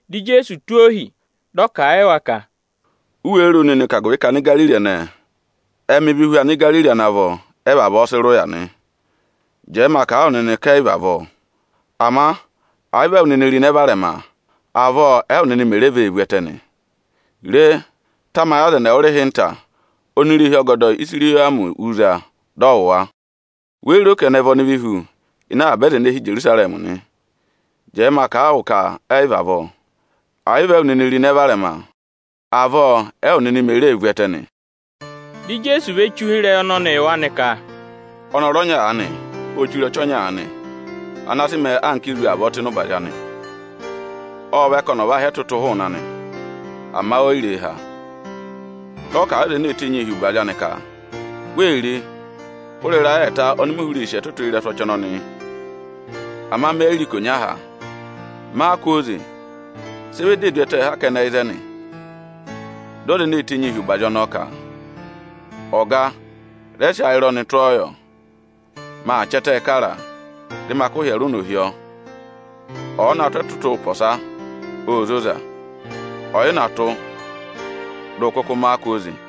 Dị Ijeesu tụ́ ohi, dị ọ kà a yị wa ka, “U wéé ro nịnị ka agụvị ka Anigariri ẹnẹẹ ệ mẹ ịvị hu Anigariri ana vọ, ẹ vavọọ sị rị ụya nị? Jẹẹ ma kà a wụ nịnị ka ẹ yị vị avọọ. Ama ẹ̀ yị vị ụ ro ịnẹ varẹma nịnị, avọọ ẹwụ nịnị mè re vee vu ẹtẹ nị. Rẹ tamayị aza ẹnị ẹwụrịhịnta, oni irehi ọgọdọ Ịsayịrọmị wú za, dị ọ wụ̀ wa. Wéé ro ka ẹnị ẹ vị ọnịvị hu ịnị avaba aza ene hi Ijerusarẹmị nị? Jẹẹ ma kà a wụ ka ẹ yị vị avọọ. Ẹ̀ yị vị ụ ro ịnẹ varẹma nịnị, avọọ ẹwụ nịnị mè ree vu ẹtẹ nị.” Dị Ijeesu ve che ụhịrẹyị ọnọnị yị wa nị ka, “Â nyị ọnọrụ ọnya ene chire ọchị ọnya aanị, ana sị mẹẹ anka ezu tụ́ ịnị ụbazị anị. Ộ vẹ ka ọnị ọ̀ va há ẹtụtụ hụụnị anị, ama o yi re há. Dị ọ kà a yị ọza enee tenyii hi ụbazị anị ka: ‘Re! Hụrẹ ịrayị ẹẹta ọnị mị hụrẹ ee sì ẹtụtụ ịrẹsụ ọchị ọnọnị yị, ama me yi re ikonya há. Má a kwooze! Sị ọ yà ịzẹnị ee du ẹtẹẹ haa mẹ!’ Dị ọza ene ee tenyii hi ụbazị ọnọọ ka, Ọga, rẹ sị ayịrọnị tụ́ ọọ yọ. Maa chị ẹtẹẹ kara a, dị ma kụ́ ịhyẹrẹ ụnọ hi ọ. Ọ̀ọ na tụ́ ẹtụtụ ụpọsa, ô zoza; ọ̀ yị na tụ́, dị ụ kụkụ má a kwooze!”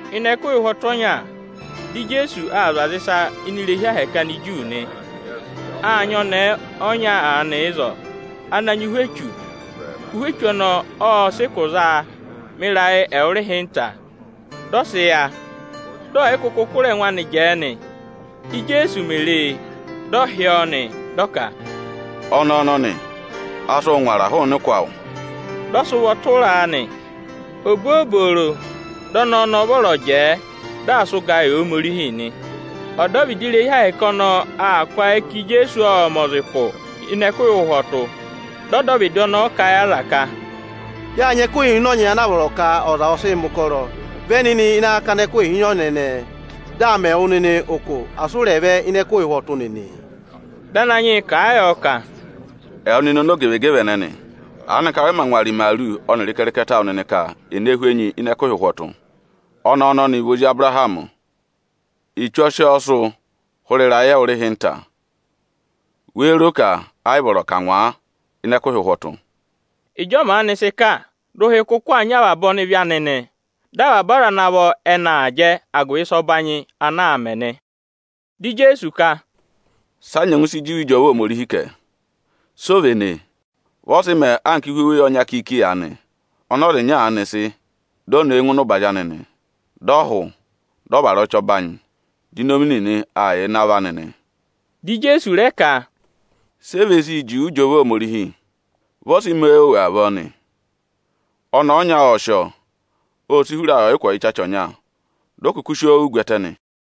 Ịnị ẹkụhị ụhwọtụ ọnya, di Ijeesu aa zụ̀ aza ịsa ini irehi Ohomorihi Aniju nị. Â nyị ọnẹẹ ọnya aanị ịzọọ ana nyị ụhwẹ echu. Ụhwẹ echu ọnọọ ộ sị ụkụ za a mẹ ịrayị ẹwụrịhịnta, dị ọ sị yá, dị ọ̀ yị kụkụ zụ kụ̀rà ẹngụ anị jẹẹ nị. Íjeesu mè re e, ộ hị́ ọ, dị ọ ka, “Ọnẹẹ ọnọnị, a sị wụ ngwara hụụnị ụkụ awụ!” Dị ọ sị ụvọ tụra a nị. Obooboro ọnọọ dị ọnẹẹ ọnọọ vọrọ jẹẹ, dị aa sị ụgaa yị Ohomorihi nị. Ọdọvịdị irehi Ohomorihi ọnọọ aa kụ́ ayị ka Ijeesu ộ mẹ̀ ọza ụkụ ịnị ẹkụhị ụhwọtụ. Dị ọdọvịdị ọnọọ kà a yị aza ka, “Yâ nyị ẹkụhị ịhịnọnyị ana a vọrọ ka ọza ọ̀ sị mẹ̀ ụkọrọ. Vẹ nịnị ịnị akakana ẹkụhị ịhịnọnyị ẹnẹẹ, dị à mẹ wụ nịnị ụkụ, asị ụ rẹ̀ vẹ ịnị ẹkụhị ụhwọtụ nịnị!” Dị Ananyị yị kà a yọ ka, “Ẹwụ nịnị ọmọzakụyẹ ẹnẹnị, aanịka wẹ mā ngwara imaaru ọnịrị ịkẹrịkẹtẹ awụ nịnị ka è ne hú enyi ịnị ẹkụhị ụhwọtụ? Ọnẹẹ ọnọnị vị ozi Abụrahamị. Echu ọ sị ọọ sụ́ hụrẹ ịrayị ẹwụrịhịnta. Wéé ro ka ẹ yị vọrọ ka à ngwa a ịnị ẹkụhị ụhwọtụ?” Ịjị ọ maanị sị kà, dị ụhị kụkụ aa nyị avaba ọnịvị anị nị. Dị avaba aza ana vọ ẹnị aa jẹ agụvị ịsa ọbanyị ana aa mẹ nị. Dị Ijeesu ka, “Sị a nyẹngụ sị juwe ịjọva Ohomorihi kẹ, si o véné? Vị ọ sị mẹẹ anka ihu oweyi ọnya kiiki aanị, ọnị ọza ịnya aanị sị, di o ne e ngụ ịnị ụbazị anị nị. Dị ọ hụ, dị ọ vara ọchị ọbanyị, di inomi nịnị mẹ ịrẹngwẹ hi ịnị avọ anị nị.” Dị Ijeesu rẹ ka, “Si e ve sii juwe ịjọva Ohomorihi? Vị ọ sị mẹẹ òwù avọọ nị. Ọnẹẹ ọnya ộ sị ọọ, ô si hura ayị ọyịkwọ ịchacha ọnya, di o kuku si oo wù gwẹtẹ nị.”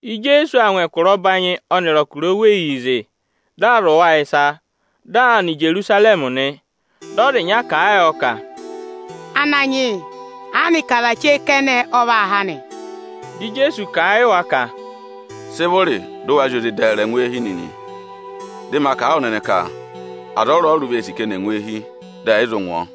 Ijeesu aa ngụ ẹkụra ọbanyị ọnịrị ẹkụra oweyii zị, dị aa zụ̀ wa ịsa, dị aa nọ Ijerusarẹmị nị. Dị ọza ịnya kà a yọ ka, “Ananyị yị, aanịka aza chee kẹnẹ ọ vaa há nị?” Dị Ijeesu kà a yị wa ka, “Sị vụrị dị ụ wa zị oze dẹẹrẹ ngụ eehi nịnị! Dị ma kà a wụ nịnị ka aza ọrụrụ vee sì ka ẹnị ẹ̀ ngụ eehi, dị ẹ̀ yị zụ ngụ ọọ.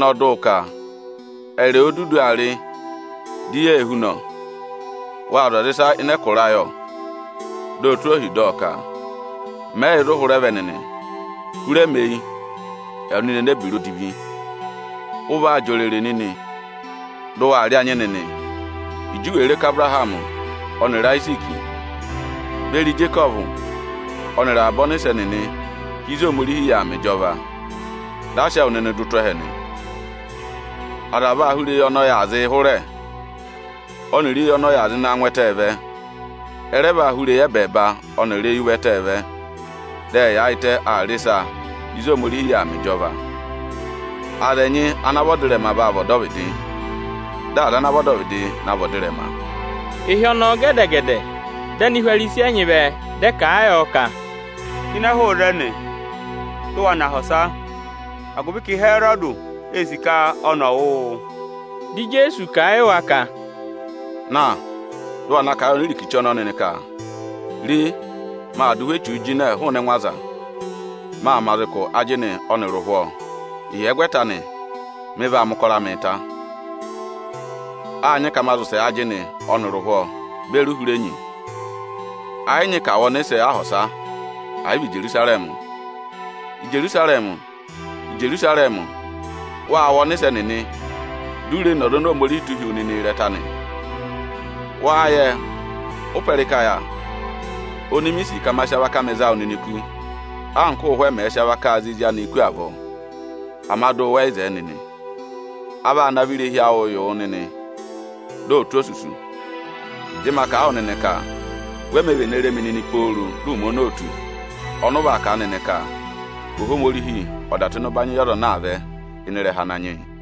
Ịjọnọọ dị ụ ka: ‘Ẹyịrị ẹwụ o dudu aa rị, di yee hú nọ! Wâ zụ̀ aza ịsa ịnị ẹkụra ayị, ọ!’ Di o tụ́ ohi dị ọ ka: ‘Mẹ yị yẹ ịzị ụ hụrẹ vẹ nịnị. Hụrẹ mi eyi, ẹwụ nịnị enebira odivi ẹnẹnị!’ Ụ vaa jị òrèrè nịnị, dị ụ waa rị anyị nịnị, Ịjị u wèe re ka Abụrahamị ọnịrị Ayiziiki beri Ijekọvụ ọnịrị avaba ọnịsẹ nịnị hi ịzị Ohomorihi yà aa mẹ ịjọva, di a sị ẹwụ nịnị dụ tụ́ ẹhẹ nị. Aza vaa hụrẹ eyi ọnị ọyị aa zịị hụrẹ ọnịrị eyi ọnị ọyị aa zịị na ngụ ẹtẹ vẹ; ẹ rẹ vaa hụrẹ eyi ẹbẹẹba ọnịrị eyi ụvẹtẹẹ vẹ, dị ẹ yaayịtẹ aa rị ịsa ịzị Ohomorihi yà aa mẹ ịjọva. Aza ẹnyị ana vị ọdịrẹma vaa vị ọdọvịdị, dị aza ana vị ọdọvịdị na vị ọdịrẹma.” Ịhị ọnọọ gẹdẹ-gẹdẹ, dị Anihwarisi ẹnyị vẹ, dị ẹ kà a yọ ka, “Jịnẹ hụụ ịzẹnị, dị ụ wa nọ aha ọsa; agụvị ka Ịhẹrọdị ee sì ka ọnị ọ̀ wụ wụ.” Di Ijeesu kà a yị wa ka, “Na, dị ụ wa na kà a yị onirikichi ọnọọ nịnị ka: ‘Re, maa dụ ụhwẹ echuu jịnẹ hụụnị ẹngụ aza, maa mẹ̀ aza ụkụ ajịnị ọnịrị ụhwọọ, Ịhyẹgwẹta anị, mị vaa mẹ̀ ụkọrọ amịị ta.’ Â nyị ka ma zị ụsẹ ajịnị ọnịrị ụhwọọ beri uhurenyi. Ẹ yị nyị ka à wụ ọnịsẹ aha ọsa, ẹ̀ yị vị Ijerusarẹmị.” “Ijerusarẹmị! Ijerusarẹmị! Ụụ̄ wụ ọnịsẹ nịnị, di u reē ne ọza oni Ohomorihi ọ̀ọ tụ́ hi wu nịnị ịrẹta nị. Wáá yẹ, ụ́pẹ ịrịka yà oni mi sì ka ma sị avaka amị za wụ nịnị kú, anka ụ́ụhwẹ mẹ̀ẹ̄ sị avakaa za ezi anịị kú avọọ; ama dụ wẹ yị zẹẹ nịnị. A vaa navọ irehi awụụ yị wụ nịnị, dị ọ tụ́ osusu. Dị ma kà a wụ nịnị ka we mē vene re mi nịnị pooro dị ụmẹ ọnọọ ò tù, ọnị ụ vaa kà a nịnị ka: ‘Ohomorihi ọ̀ dà tụ́ ịnị ụbanyị yị ọza ana aa vẹ ịnị ịrẹha Ananyị yị.’”